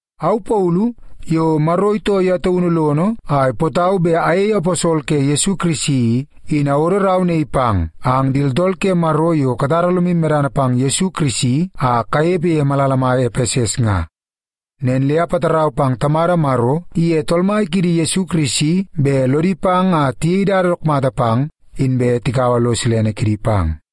Au Paulu, yo Maro itoo ye taunu lono a ipootau bet ayei aposol ke Yesu Kirisi i, in awodo rau naii pang ang di tooltool ke Maro yo katara lomu medana pang Yesu Kirisi a kanepe ye malala mai Epeses nga. Nen le apatarau pang Tamada Maro iye Tool Mai kiidi Yesu Kirisi bet lodi pang a tiyei dada dook mata pang, inbe tikaua lo silene kidi pang.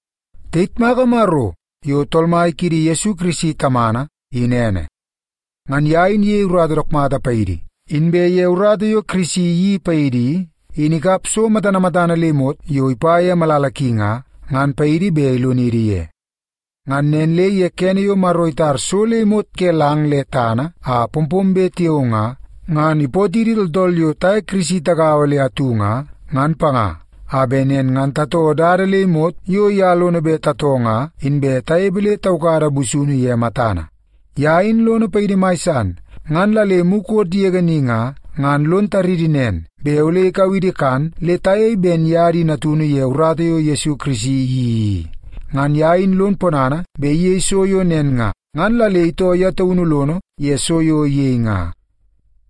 Tayitmaka Maro yo Tool Mai kiidi Yesu Kirisi Tamana, in ene. Ngan ye in iyei urata dook mata paidi, inbe ye urata yo Kirisi iyeii paidi i, in ikap so matana matana le imot yo ipa ye malala ki nga, ngan paidi bet ilonidi ye. Ngan nen le ye kene yo Maro itar so le imot ke lang le tana a pompombe tiao nga, ngan ipootidi tooltool yo taye Kirisi tagaua le atu nga, ngan panga, a bet nen ngan tatoo dada le imot yo ye lono bet tatoo nga, inbe tanepe le taukada busunu ye matana. Ye in lono paidi mai san, ngan la le mukot yege ni nga, ngan lon taridi nen, bet ole ikau idi kan le tayei ben ye di natunu ye urata yo Yesu Kirisi iyeii i. Ngan ye in lon ponana bet iyei so yo nen nga, ngan la le itoo ye taunu lono ye so yo iyei nga.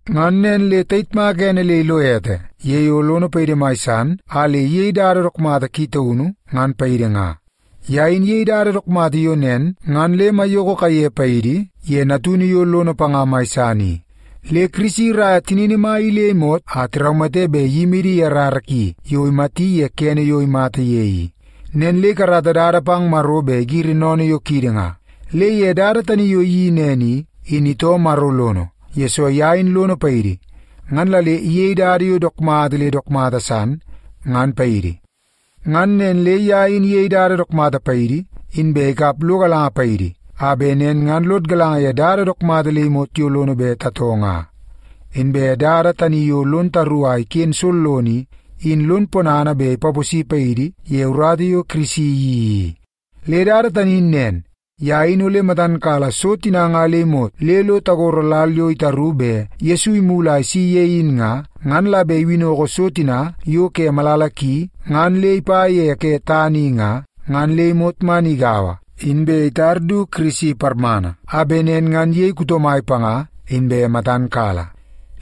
Ngan nen le tayitmaka ene le ilo ete ye yo lono paidi mai san a le iyei dada yo dook mata ki taunu, ngan paidi nga. Ye in iyei dada dook mata yo nen ngan le maiyoko kaiye paidi, ye Natunu yo lono panga mai san i. Le Kirisi iraia tinini mai i le imot a tiraumate bet iyimidi ye rara ki yo imati ye kene yo imata ye i. Nen le ikarata dada pang Maro bet igiri sennene yo kiidi nga. Le ye dada tani yo iyeii nen i, in itoo Maro lono, yesoo ye in lono paidi ngan la le iyei dada yo dook mata le dook mata san, ngan paidi. Ngan nen le ye in iyei dada dook mata paidi, inbe ikap lo galanga paidi, a bet nen ngan lod galanga ye dada dook mata le imot yo lono bet tatoo nga. Inbe dada tani yo lon taru a iken sollono i, in lon ponana bet ipaposi paidi ye urata yo Kirisi iyeii i. Le dada tani in nen: Ye in ole matan kala so tina nga le imot le lo tagoro lal yo itaru bet Yesu imulu a isi ye in nga, ngan la bet iwinnoko so tina yo ke malala ki ngan le ipa ye ke tana i nga, ngan le imot man igaua, inbe itar du Kirisi parmana a bet nen ngan iyei kuto mai panga inbe matan kala.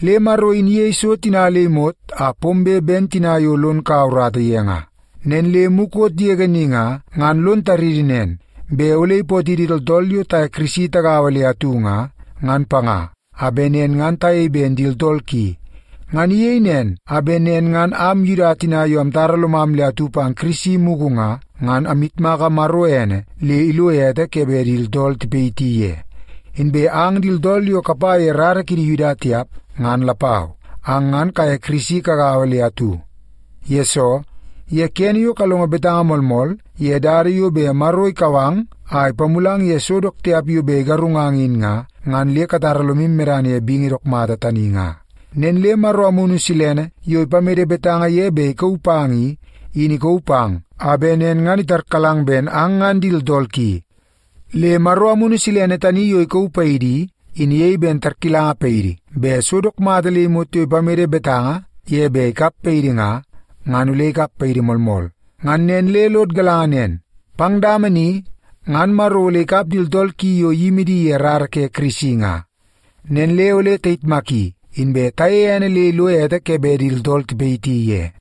Le Maro in iyei so tina le imot a pombe ben tina yo lon kaua urata ye nga. Nen le mukot yege ni nga, ngan lon taridi nen, bet ole ipootidi tooltool yo taye Kirisi tagaua le atu nga, ngan panga, a bet nen ngan tayei ben di tooltool ki. Ngan iyei nen a bet nen ngan am Yuda tina yo amtara lomam le atu pang Kirisi mugu nga, ngan amyitmaka Maro ene le ilo ete ke bet di tooltool tipayiti ye. Inbe ang di tooltool yo kapa ye rara kidi Yuda tiap, ngan lapau, ang ngan kaye Kirisi kagaua le atu. Yesoo, ye kene yo kalongo betanga moolmool ye dada yo bet Maro ikau ang a ipamulang ye so dook tiap yo bet igarungang in nga, ngan le katara lomu medana ye bingi dook mata tani nga. Nen le Maro Amunu Silene yo ipamede betanga ye bet ikauu pang i, in ikauu pang a bet nen ngan itarkalang ben ang ngan di tooltool ki. Le Maro Amunu Silene tani yo ikauu paidi i, in iyei ben tarkilanga paidi bet so dook mata le imot yo ipamede betanga ye bet ikap paidi nga, ngan ole ikap paidi moolmool. Ngan nen le lod galanga nen, pang dama ni ngan Maro ole ikap di tooltool ki yo iyimi di ye rara ke Kirisi nga. Nen le ole tayitmaki, inbe tayeie ene le ilo ete ke bet di tooltool tipayiti ye.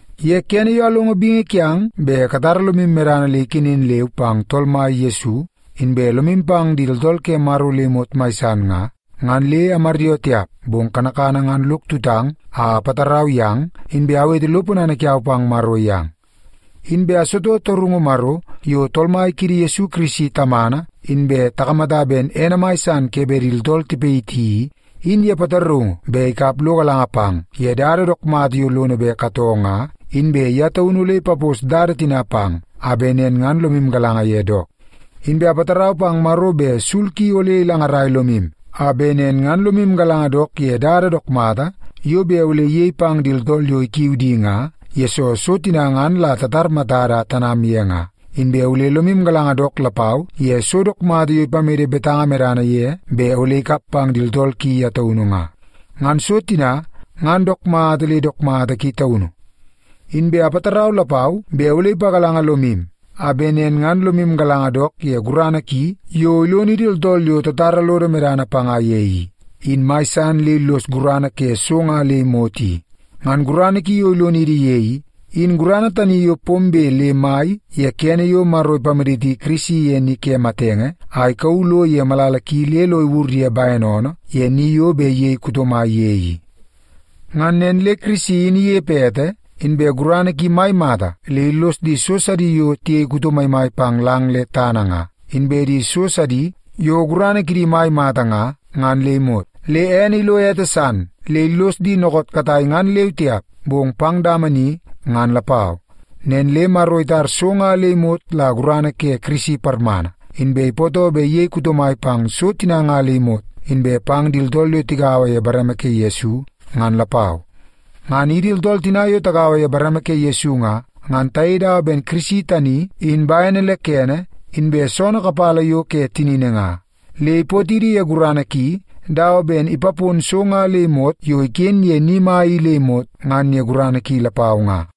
Ye kene yo alongo bingi kiang bet katara lomu medana le ikenen leu pang Tool Mai Yesu, inbe lomu pang di tooltool ke Maro le imot mai san nga, ngan le amaryoo tiap, bong kanakana ngan lok tutang a apatarau yang, inbe awete lo ponana kiau pang Maro yang. Inbe asitoo torungu Maro, yo Tool Mai kiidi Yesu Kirisi Tamana inbe takamata ben ene mai san ke bet di tooltool tipayiti i, in ye pataraungu bet ikap lo galanga pang ye dada dook mata yo lono bet katoo nga, inbe ye taunu ole ipapos dada tina pang, a bet nen ngan lomu galanga ye dook. Inbe apatarau pang Maro bet sul ki ole ilangarai lomu, a bet nen ngan lomu galanga dook ye dada dook mata yo bet ole iyei pang di tooltool yo ikiu di nga, yesoo so tina ngan la tatar matada a tanam ye nga, inbe ole lomu galanga dook lapau ye so dook mata yo ipamede betanga medana ye bet ole ikap pang di tooltool ki ye taunu nga. Ngan so tina ngan dook mata le dook mata ki taunu. Inbe apatarau lapau bet ole ipagalanga lomu, a bet nen ngan lomu galanga dook ye gurana ki yo ilonidi tooltool yo tatara lodo medana panga ye i, in mai san le illos gurana ke so nga le imot i. Ngan gurana ki yo ilonidi ye i, in gurana tani yo pombe le mai ye kene yo Maro ipamaditi Kirisi ye ni ke matenge a ikauu lo ye malala ki le lo iwur ye bene oonoo ye ni yo bet iyei kuto mai ye i. Ngan nen le Kirisi in inepe ete, inbe gurana ki mai mata le illos di so sidi yo tiyei kuto maimai pang lang le tana nga, inbe di so sidi yo gurana kidi mai mata nga, ngan le imot. Le ene ilo ete san, le illos di dookoot katai ngan leu tiap, bong pang dama ni ngan lapau. Nen le Maro itar so nga le imot la gurana ke Kirisi parmana, inbe ipootoo bet iyei kuto mai pang so tina nga le imot, inbe pang di tooltool yo tigaua ye bareme ke Yesu ngan lapau. Ngan idi tooltool tina yo tagaua ye bareme ke Yesu nga, ngan tayei dawa ben Kirisi tani in bene le kene inbe soonoo kapala yo ke tinini nga. Le ipaponidi ye gurana ki, dawa ben ipapon so nga le imot yo iken ye ni mai i le imot ngan ye gurana ki lapau nga.